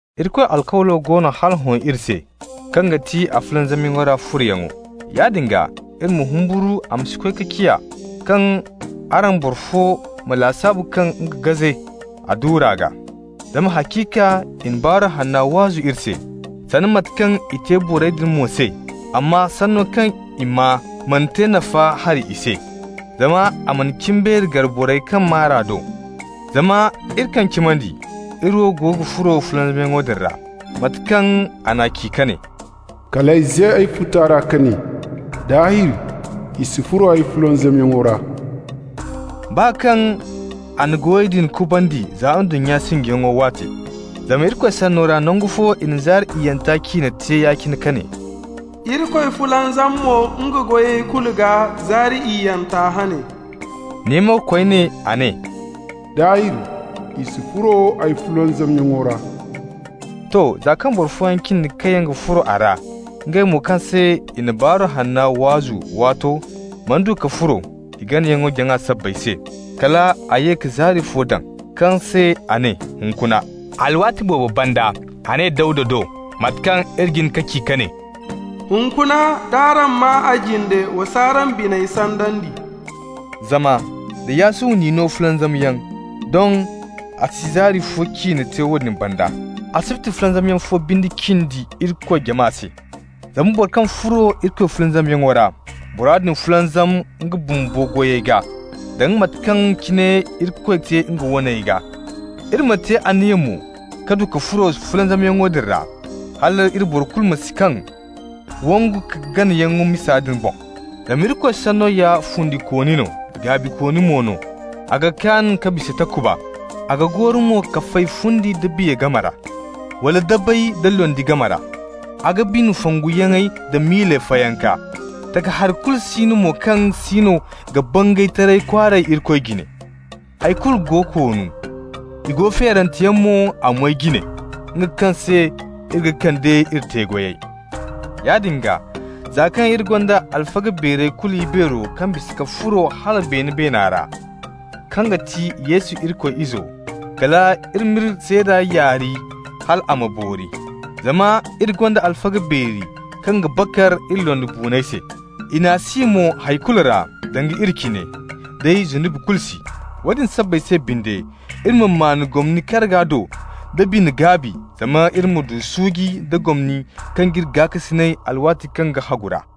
Irikoy alkawlo go no hala hõ iri se, kaŋ ga ti a fulanzamyaŋo ra furoyaŋo. Yaadin gaa iri ma humburu a ma si koy ka ciya kaŋ araŋ boro fo ma lasaabu kaŋ nga gaze a duura gaa. Zama haciika i na Baaru Hanna waazu iri se, sanda mate kaŋ i te borey din mo se, amma sanno kaŋ i maa mana te nafa hari i se, zama a mana cimbeeri gar borey kaŋ maa r'a do. Zama iri kaŋ cimandi, iri wo go ga furo fulanzamyaŋo din ra, mate kaŋ a ci ka ne: «Kal ay ze ay futa ra ka ne: ‹Daahir i si furo ay fulanzamyaŋo ra›» baa kaŋ a na goyey kubandi za ndunnya sinjiyaŋo waate. Zama Irikoy Sanno ra nangu fo i na zaari iyyanta ciine te ya-cine ka ne: «Irikoy fulanzam mo nga goyey kulu gaa zaari iyyanta hane.» Ne mo koyne a ne: «Daahir i si furo ay fulanzamyaŋo ra.» To. Za kaŋ boro fooyaŋ cindi kaŋ yaŋ ga furo a ra, ngey mo kaŋ se i na Baaru Hanna waazu waato mana du ka furo i ganayaŋ-jaŋa sabbay se, kala a ye ka zaari fo daŋ, kaŋ se a ne «Hunkuna.» Alwaati boobo banda a ne Dawda do (mate kaŋ iri jin ka ci ka ne:) «Hunkuna, d'araŋ maa a jinde, wa s'araŋ biney sandandi.» Zama da Yasuwa n'i no fulanzamyaŋ, doŋ a si zaari fo ciine te woodin banda. Asibti fulanzamyaŋ fo binde cindi Irikoy jama se. Zama boro kaŋ furo Irikoy fulanzamyaŋo ra, bora din fulanzam nga bumbo goyey gaa, danga mate kaŋ cine Irikoy te nga waney gaa. Iri ma te anniya mo ka du ka furo fulanzamyaŋo din ra, hal iri boro kulu ma si kaŋ wangu-ka-ganayaŋ misa din boŋ. Zama Irikoy Sanno ya fundikooni no, gaabikooni mo no. A ga kaan ka bisa takuba, a ga gooru mo ka fay fundi nda biya game ra, wala dabey da londi game ra. A ga bine fonguyaŋey d'a miiley fayanka. Takahari kulu si no mo kaŋ siino ga bangay taray kwaaray Irikoy jine. Hay kulu go koonu, i go feerante yaŋ mo a moy jine, nga kaŋ se iri ga kande iri te-goyey. Yaadin gaa, za kaŋ iri gonda alfaga beerey kulu ibeero kaŋ bisa ka furo hala beene beena ra, kaŋ ga ti Yesu Irikoy Izo, kal iri m'iri seeda yaari hal a ma boori. Zama iri gonda alfaga beeri kaŋ ga bakar iri londibuunay se, i n'a si mo hay kulu ra danga iri cine, day zunubi kulu si. Woodin sabbay se binde iri ma maan gomni karga do da bine-gaabi, zama iri ma du suuji nda gomni kaŋ g'iri gaakasinay alwaati kaŋ ga hagu ra.